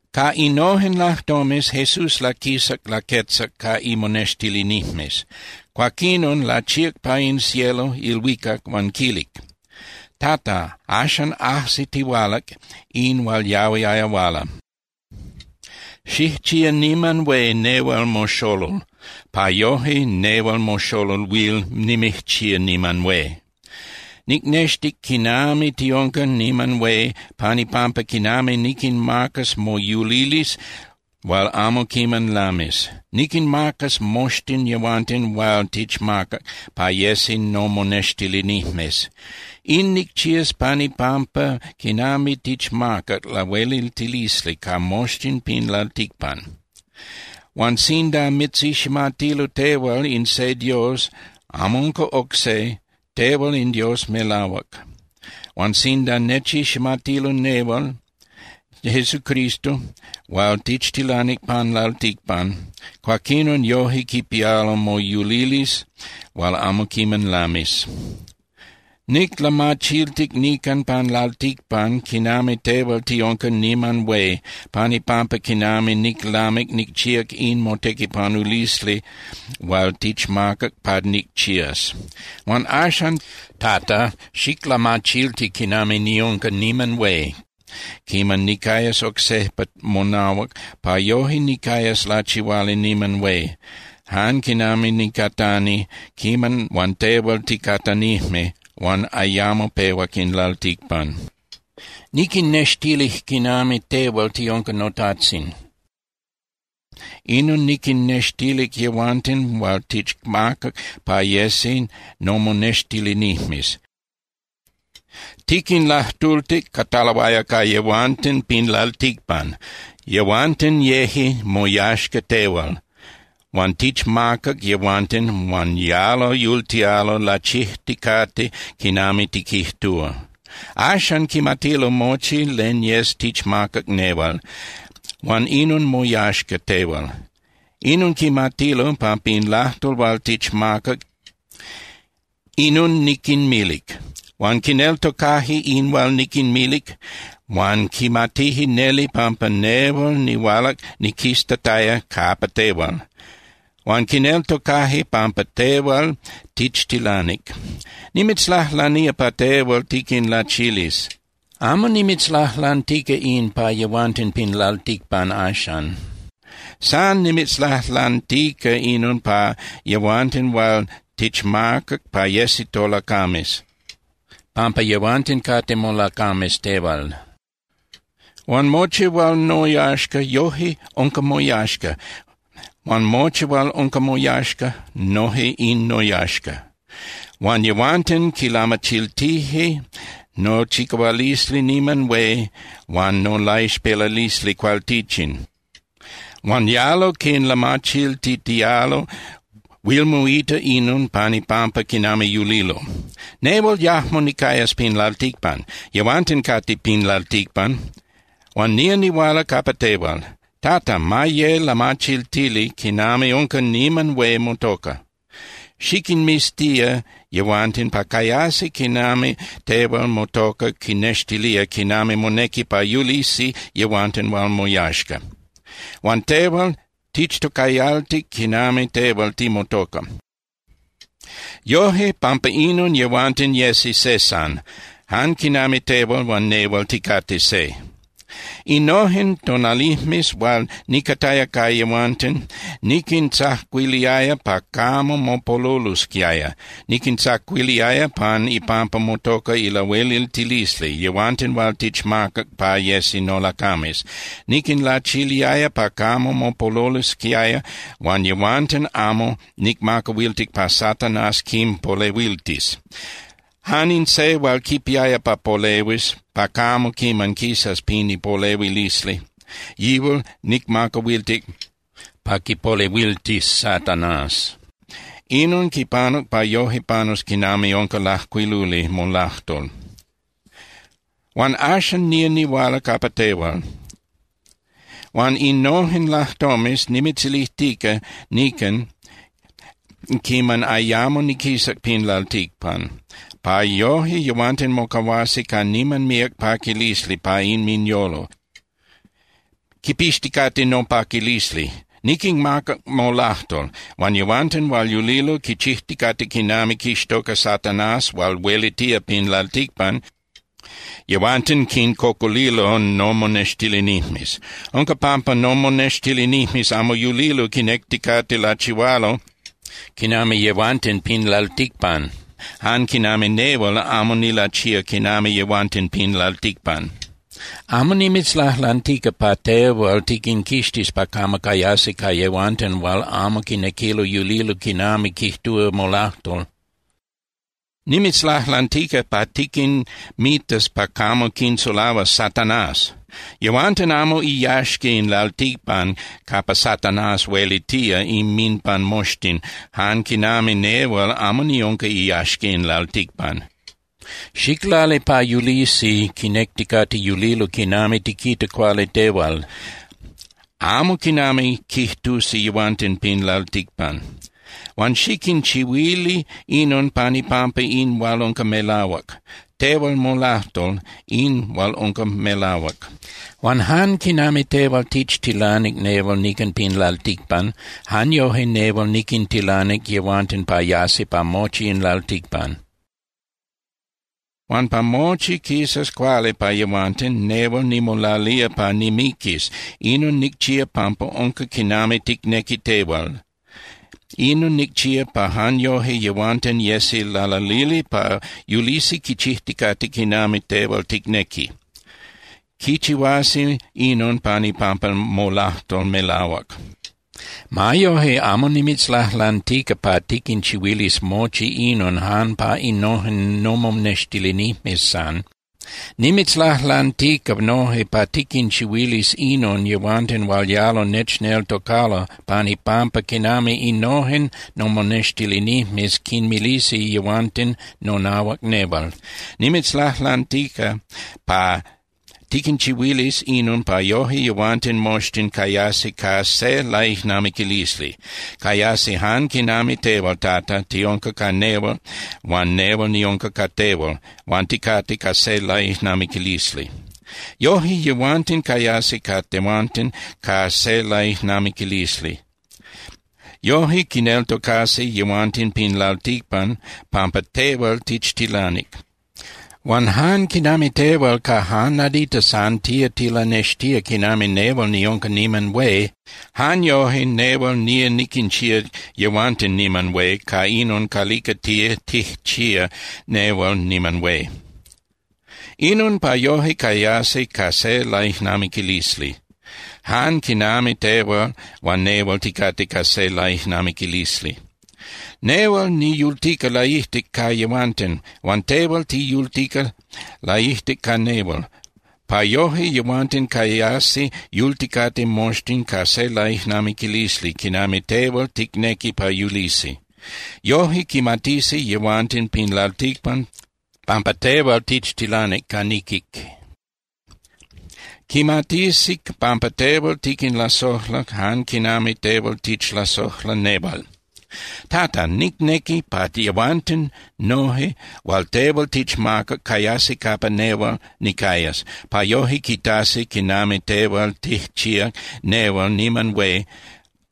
Ca innojen lajtomes, Jesús laquisac laquetzac ca imonextilinijmes. Cuaquinon lachíac pa in cielo (ilhuicac) huan quilic: —Tata, axan ajsitihualac in hual yahuiaya huala. Xijchía niman hué nehual moxolol, pa yoje nehual moxolol huil nimijchía niman hué. Nicnextic quinami tiunca niman hué pan ipampa quinami niquinmacas moyulilisli hual amo quiman lamis. Niquinmacas moxtin yehuanten hual tichmacac pa yesi nomonextilinijmes. In nicchías pan ipampa quinami tichmacac lahueliltilisli ca moxtin pin lalticpan. Huan sinda mitziximatilo tehual in se Dios, amo unca oc se, tehual in Dios melahuac, huan sinda nechiximatilo nehual Jesucristo hual tichtilanic pan lalticpan, cuaquinon yoje quipialo moyulilisli hual amo quiman lamis. ’Niclamachiltic nican pan lalticpan quinami tehual tiunca niman hué pan ipampa quinami niclamic nicchíac in motequipanulisli hual tichmacac pa nicchías. Huan axan, Tata, xiclamachilti quinami niunca niman hué quiman nicayas oc sejpa monahuac, pa yoje nicayas lachihuali niman hué, jan quinami nicatani quiman huan tehual ticatanijme huan ayamo pehuac in lalticpan. ’Niquinnextilic quinami tehual tiunca noTajtzin, inon niquinnextilic yehuanten hual tichmacac pa yesi nomonextilinijmes. Tiquinlajtultic, cataloaya ca yehuanten pin lalticpan. Yehuanten yeje moyaxca tehual, huan tichmacac yehuanten huan yalo yultialo lachijticate quinami tiquijtúa. Axan quimatilo mochi len yes tichmacac nehual, huan inon moyaxca tehual. Inon quimatilo, pampa in lajtol hual tichmacac, inon niquinmilic. Huan quineltocaje in hual niquinmilic, huan quimatije neli pampa nehual nihualac niquistataya capa tehual. Huan quineltocaje pampa tehual tichtilanic. ’Nimitzlajlanía pa tehual tiquinlachilis. Amo nimitzlajlantica in pa yehuanten pin lalticpan axan. San nimitzlajlantica inon pa yehuanten hual tichmacac pa yesi tolacames, pampa yehuanten cate molacames tehual. Huan mochi hual noyaxca, noje unca moyaxca, huan mochi hual unca moyaxca, noje in noyaxca. Huan yehuanten quinlamachiltije nochicahualisli niman hué huan nolaixpelalisli cualtichin. Huan yalo quinlamachiltitialo, huil moita inon pan ipampa quinami yulilo. ’Nehual yajmo nicayas pin lalticpan. Yehuanten cate pin lalticpan, huan nía nihuala capa tehual. Tata, ma ye lamachiltili quinami unca niman hué motoca. Xiquinmiztía yehuanten pa cayasi quinami tehual motoca quinnextilía quinami monequi pa yulisi yehuanten hual moyaxca. Huan tehual tichtocayaltic quinami tehual timotoca. Yoje, pampa inon yehuanten yesi se san, jan quinami tehual huan nehual ticate se. Innojen tonalijmes hual nicataya ca yehuanten, niquintzacuiliaya pa camo mopolulosquiaya. Niquintzacuiliaya pan ipampa motoca ilahueliltilisli, yehuanten hual tichmacac pa yesi nolacames. Niquinlachiliaya pa camo mopolulosquiaya, huan yehuanten amo nicmacahuiltic pa Satanás quinpolehuiltis. Jan in se hual quipiaya pa polehuis pa camo quiman quisas pin ipolehuilisli, yihual nicmacahuiltic pa quipolehuiltis Satanás. Inon quipanuc pa yoje panus quinami unca lajcuiluli molajtol. ’Huan axan nía nihuala capa tehual. Huan innojen lajtomes nimitzilijtica nican quiman ayamo niquisac pin lalticpan, pa yoje yehuanten mocahuasi ca niman míac paquilisli pa inminyolo, quipixticate nopaquilisli. Niquinmacac molajtol. Huan yehuanten hual yulilo quichijticate quinami quixtoca Satanás hual huelitía pin lalticpan, yehuanten quincocolilo nomonextilinijmes. Unca pampa nomonextilinijmes amo yulilo quinecticate lachihualo quinami yehuanten pin lalticpan, jan quinami nehual amo nilachía quinami yehuanten pin lalticpan. Amo nimitzlajlantica pa tehual tiquinquixtis pa camo cayasi ca yehuanten hual amo quinequilo yulilo quinami quijtúa molajtol. Nimitzlajlantica pa tiquinmitas pa camo quinsulahuas Satanás. Yehuanten amo iyaxca in lalticpan capa Satanás huelitía inminpan moxtin, jan quinami nehual amo niunca iyaxca in lalticpan. Xiclali pa yulisi quinecticate yulilo quinami tiquita cuali tehual, amo quinami quijtusi yehuanten pin lalticpan. Huan xiquinchihuili inon pan ipampa in hual unca melahuac. Tehual molajtol, in hual unca melahuac. Huan jan quinami tehual tichtilanic nehual nican pin lalticpan, jan yoje nehual niquintilanic yehuanten pa yasi pa mochi in lalticpan. Huan pa mochi quisas cuali pa yehuanten, nehual nimolalía pa nimiquis, inon nicchía pampa unca quinami ticnequi tehual. Inon nicchía pa jan yoje yehuanten yesi lalalili pa yulisi quichijticate quinami tehual ticnequi. Quichihuasi inon pan ipampa molajtol melahuac. ’Ma yoje, amo nimitzlajlantica pa tiquinchihuilis mochi inon jan pa innojen nomonextilinijmes san. Nimitzlajlantica noje pa tiquinchihuilis inon yehuanten hual yalo nechneltocalo pan ipampa quinami innojen nomonextilinijmes quinmilisi yehuanten nonahuac nehual. Nimitzlajlantica pa tiquinchihuilis inon pa yoje yehuanten moxtin cayasi ca se laijnamiquilisli. Cayasi jan quinami tehual, Tata, tiunca ca nehual huan nehual niunca ca tehual, huan ticate ca se laijnamiquilisli. Yoje yehuanten cayasi ca tehuanten ca se laijnamiquilisli. Yoje quineltocasi yehuanten pin lalticpan pampa tehual tichtilanic. Huan jan quinami tehual ca jan nadita san tía tilanextía quinami nehual niunca niman hué, jan yoje nehual nía niquinchía yehuanten niman hué ca inon calica tía tijchía nehual niman hué. Inon pa yoje cayasi ca se laijnamiquilisli, jan quinami tehual huan nehual ticate ca se laijnamiquilisli. Nehual niyultica laijtic ca yehuanten, huan tehual tiyultica laijtic ca nehual, pa yoje yehuanten cayasi yulticate moxtin ca se laijnamiquilisli quinami tehual ticnequi pa yulisi. Yoje quimatisi yehuanten pin lalticpan pampa tehual tichtilanic ca niquic. Quimatisi pampa tehual tiquinlasojlac jan quinami tehual tichlasojla nehual. ’Tata, nicnequi pa yehuanten noje hual tehual tichmacac cayasi capa nehual nicayas, pa yoje quitasi quinami tehual tijchíac nehual niman hué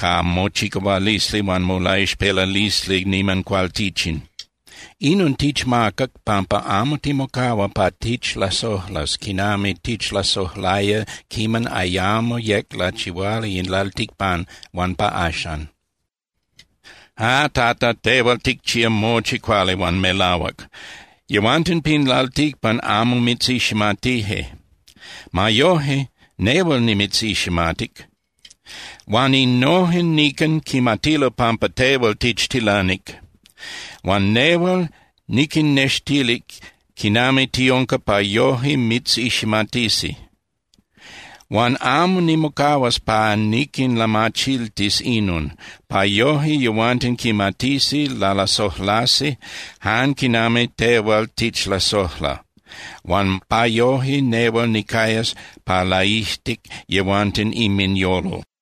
ca mochicahualisli huan molaixpelalisli niman cualtichin. Inon tichmacac pampa amo timocahua pa tichlasojlas quinami tichlasojlaya quiman ayamo yec lachihuali in lalticpan huan pa axan. Ah, Tata, tehual ticchía mochi cuali huan melahuac. Yehuanten pin lalticpan amo mitziximatije. Ma yoje, nehual nimitziximatic. Huan innojen nican quimatilo pampa tehual tichtilanic. Huan nehual niquinnextilic quinami tiunca pa yoje mitziximatisi. Huan amo nimocahuas pa niquinlamachiltis inon, pa yoje yehuanten quimatisi lalasojlasi jan quinami tehual tichlasojla, huan pa yoje nehual nicayas pa laijtic yehuanten inminyolo.